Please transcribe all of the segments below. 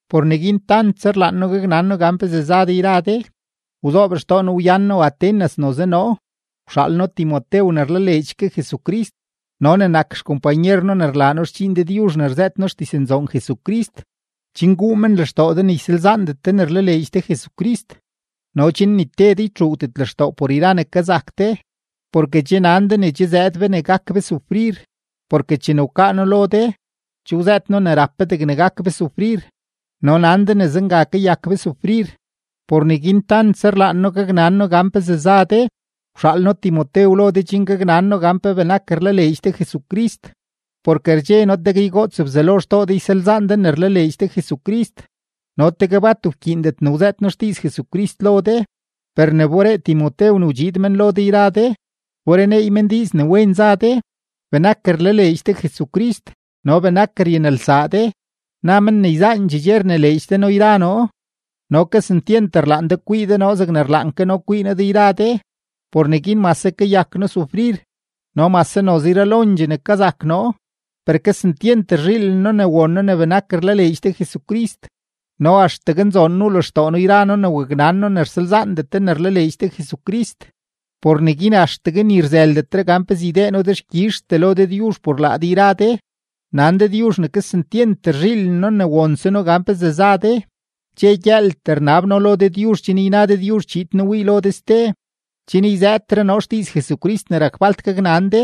Por neguin tantse rlaan noo gaknan noo gan pezee za de yra de, wzoob xtoo noo wyan noo Atenas noze noo, wxaal noo Timotew ne rlaleedx ke Jesucrist no ne nak xkompanyer noo ne rlaa noo xdxiin Dëdyuzh ne rzëët noo xdiznzoon Jesucrist, chen guu men lextoo de ne ysalzaandet de ne rlaleedx de Jesucrist no chen ni te de ytxuugdet lextoo por yra ne kazak de. Porke che nan de ne che zëëd be ne gak be sufrir, porke chene wkaa noo lo de, che wzëët noo ne rap be degne gak be sufrir, no nan de ne zenga kayak be sufrir. Por neguin por tantse rlaan noo gaknan noo gan pezee za de, wxaal noo Timotew lo de chen gaknan noo gan pe benak rlaleedx de Jesucrist. Porke rdxe noo tegue ygoots Bzelo xtoo de ysalzaan de ne rlaleedx de Jesucrist no tegue bat wkyiindet ne wzëët noo xdiiz Jesucrist lo de. Per ne wberee Timotew ne wdxiid men lo de yra de, wbereneey men diiz ne wen za de, benak rlaleedx de Jesucrist no benak ryanelsaa de. Na men ne yzaandxee dxe rnileedx de noo yra noo no kesentyent rlaan de kwii de noo zegne rlaan ke noo kwii noo de yra de. Por neguin mase kayak noo sufrir no mase noze yralo ne kazak noo, per kesentyent rzhiilen noo ne won noo ne benak rlaleedx de Jesucrist. No axtegue nzoon wuu lextoo noo yra noo ne waknan noo ne rsalzaandet de ne rlaleedx de Jesucrist. Por neguin axtegue ni rzëldetre gan pezee ydee noo dexkyizhtee lo Dëdyuzh por laa de yra de; nan Dëdyuzh ne kesentyent rzhiilen noo ne wonse noo gan pezee za de. Dxe gyëëltee rnab noo lo Dëdyuzh chen yna Dëdyuzh chiid noo wii lo de ste, chen yzëëtre noo xdiiz Jesucrist ne rak falt gaknan de.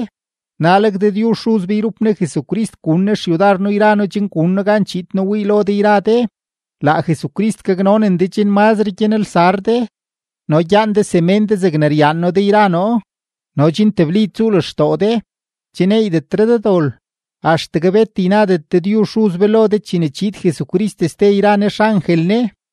Naleg Dëdyuzh Xuz be yrup Ne Jesucrist gun Ne xyudar noo yra noo chen gun noo gan chiid noo wii lo de yra de. Laa Jesucrist gaknonen de chen mazre gyanelsar de no gyaan de semén de zegne ryaan noo de yra noo no chen tebli tsuu lextoo de, che neeydetre de dol, axtegue bet ynadet Dëdyuzh Xuz be lo de chene chiid Jesucrist ste yra Ne xangel Ne.